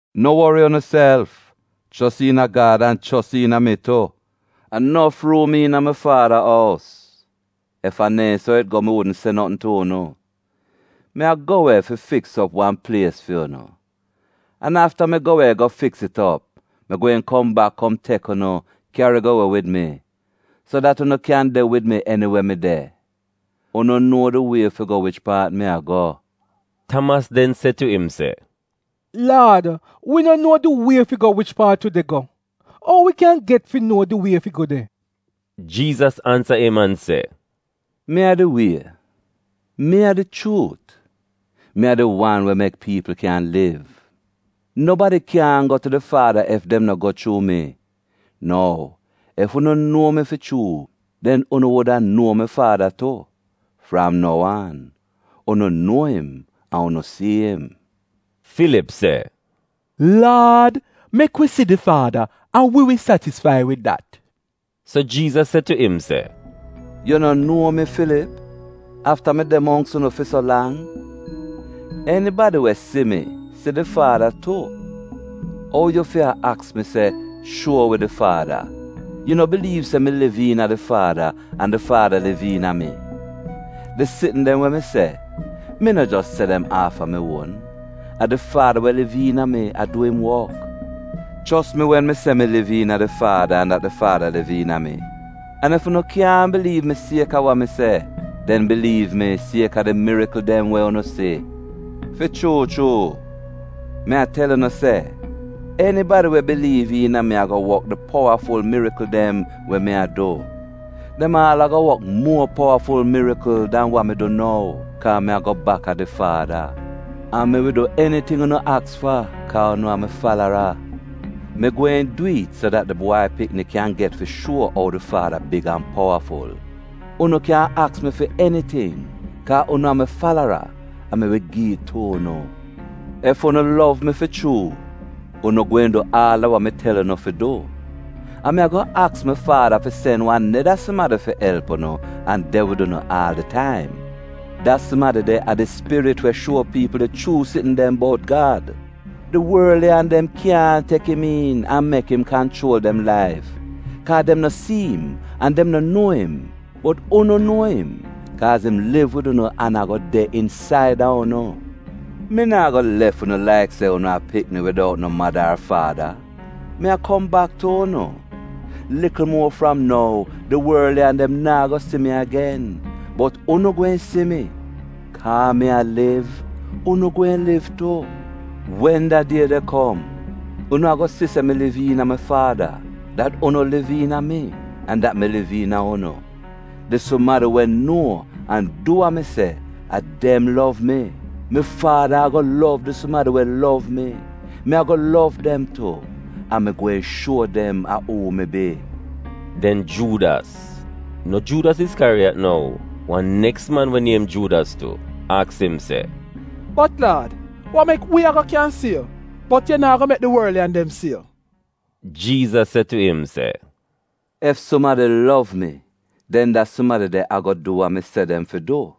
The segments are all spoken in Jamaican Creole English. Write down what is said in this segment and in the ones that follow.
“No wori unuself. Chos iina Gad, an chos iina mi tu. A nof ruum iina mi Faada ous. Ef a neehn so it go mi wudn se notn tu unu. Mi a go we fi fiks op wan plies fi unu. An afta mi go we go fiks it op, mi gweehn kom bak kom tek unu kyari go we wid mi, so dat unu kyan de wid mi eniwe mi de. Unu nuo di wie fi go wich paat mi a go.” Tamas den se tu im se, “Laad, wi no nuo di wie fi go wich paat yu de go. Ou wi kyan get fi nuo di wie fi go de?” Jiizas ansa im an se, “Mi a di wie, mi a di chuut, mi a di wan we mek piipl kyan liv. Nobadi kyaahn go tu di Faada ef dem no go chuu mi. Nou ef unu nuo mi fi chuu, den unu wuda nuo mi Faada tu. Fram nou aan, unu nuo im an unu si'im.” Filip se, “Laad, mek wi si di Faada an wi wi satisfai wid dat.” So Jiizas se tu im se: “Yu no nuo mi, Filip, afta mi de mongks unu fi so lang? Enibadi we si mi si di Faada tu. Ou yu fi a aks mi se, ‘Shuo wi di Faada’? Yu no biliiv se mi liv iina di Faada, an di Faada liv iina mi? Di sitn dem we mi se mi no jos se dem aaf a mi uon. A di Faada we liv iina mi a du im wok. Chos mi wen mi se mi liv iina di Faada an dat di Faada liv iina mi. An ef unu kyaahn biliiv mi sieka wa mi se, den biliiv mi kaaz a di mirikl dem we unu si. Fi chuu chuu mi a tel unu se enibadi we biliiv iina mi ago wok di powaful mirikl dem we mi a du. Dem aal ago wok powafula mirikl dan wa mi du nou, kaa mi a go bak a di Faada. An mi wi du eniting unu aks fa kaa unu a mi falara. Mi gweehn dwi'it so dat di Bwai Pikni kyan get fi shuo ou di Faada big an powaful. Unu kyan aks mi fi eniting kaa unu a mi falara, an mi wi gi'it tu unu. “Ef unu lov mi fi chuu, unu gweehn du aal a wa mi tel unu fi du. An mi ago aks mi Faada fi sen wan neda sumadi fi elp unu an de wid unu aal di taim. Da sumadi de a di Spirit we shuo piipl di chuu sitn dem bout Gad. Di worliyan dem kyaahn tek im iin an mek im kanchuol dem laif, kaa dem no si im an dem no nuo im. Bot unu nuo im, kaaz im liv wid unu an ago de insaida unu. Mi naa go lef unu laik se unu a pikni widout no mada ar faada. Mi a kom bak tu unu. Likl muo fram nou, di worliyan dem naa go si mi agen, bot unu gweehn si mi. Kaa mi a liv, unu gweehn liv tu. Wen da die de kom, unu ago si se mi liv iina mi Faada, dat unu liv iina mi an dat mi liv iina unu. Di sumadi we nuo an du wa mi se, a dem lov mi. Mi Faada ago lov di sumadi we lov mi. Mi ago lov dem tu, an mi gweehn shuo dem a uu mi bi.” Den Juudas — no Juudas Iskyariyat nou, wan neks man we niem Juudas tu — aks im se, “Bot, Laad, wa mek wi ago kyan si yu, bot yu naa go mek di worliyan dem si yu?” Jiizas se tu im se, “Ef sumadi lov mi den da sumadi de ago du wa mi se dem fi du.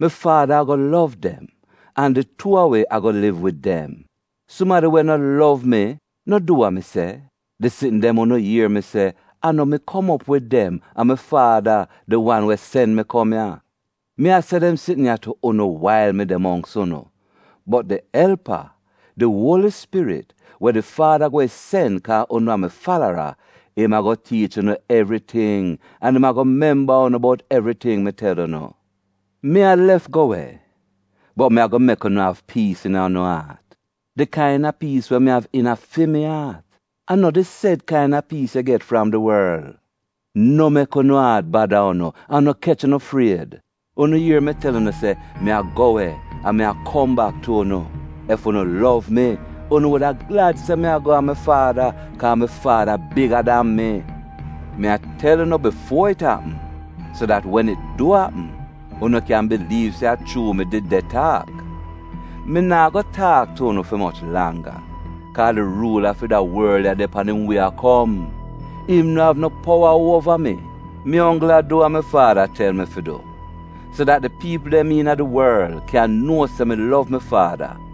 Mi Faada ago lov dem, an di tuu a wi ago liv wid dem. Sumadi we no lov mi, no du wa mi se. Di sitn dem unu ier mi se, a no mi kom op wid dem; a mi Faada, di wan we sen mi kom ya. “Mi a se dem sitn ya tu unu wail mi de mongks unu. Bot di elpa, di Uoli Spirit, we di Faada gweehn sen kaa unu a mi falara, im ago tiich unu evriting an im ago memba unu bout evriting mi tel unu. “Mi a lef go we, bot mi ago mek unu av piis iina unu aat — di kaina piis we mi av iina fi mi aat. A no di sed kaina piis yu get fram di worl. No mek unu aat bada unu, an no kech unu fried. Unu ier mi tel unu se, ‘Mi a go we an mi a kom bak tu unu.’ Ef unu lov mi, unu wuda glad se mi a go a mi Faada, kaa mi Faada biga dan mi. Mi a tel unu bifuo it apm, so dat wen it du apm unu kyan biliiv se a chuu mi did de taak. Mi naa go taak tu unu fi moch langga, kaa di ruula fi da worl ya de pan im wie a kom. Im no av no powa uova mi. Mi onggl a du wa mi Faada tel mi fi du, so dat di piipl dem iina di worl kyan nuo se mi lov mi Faada.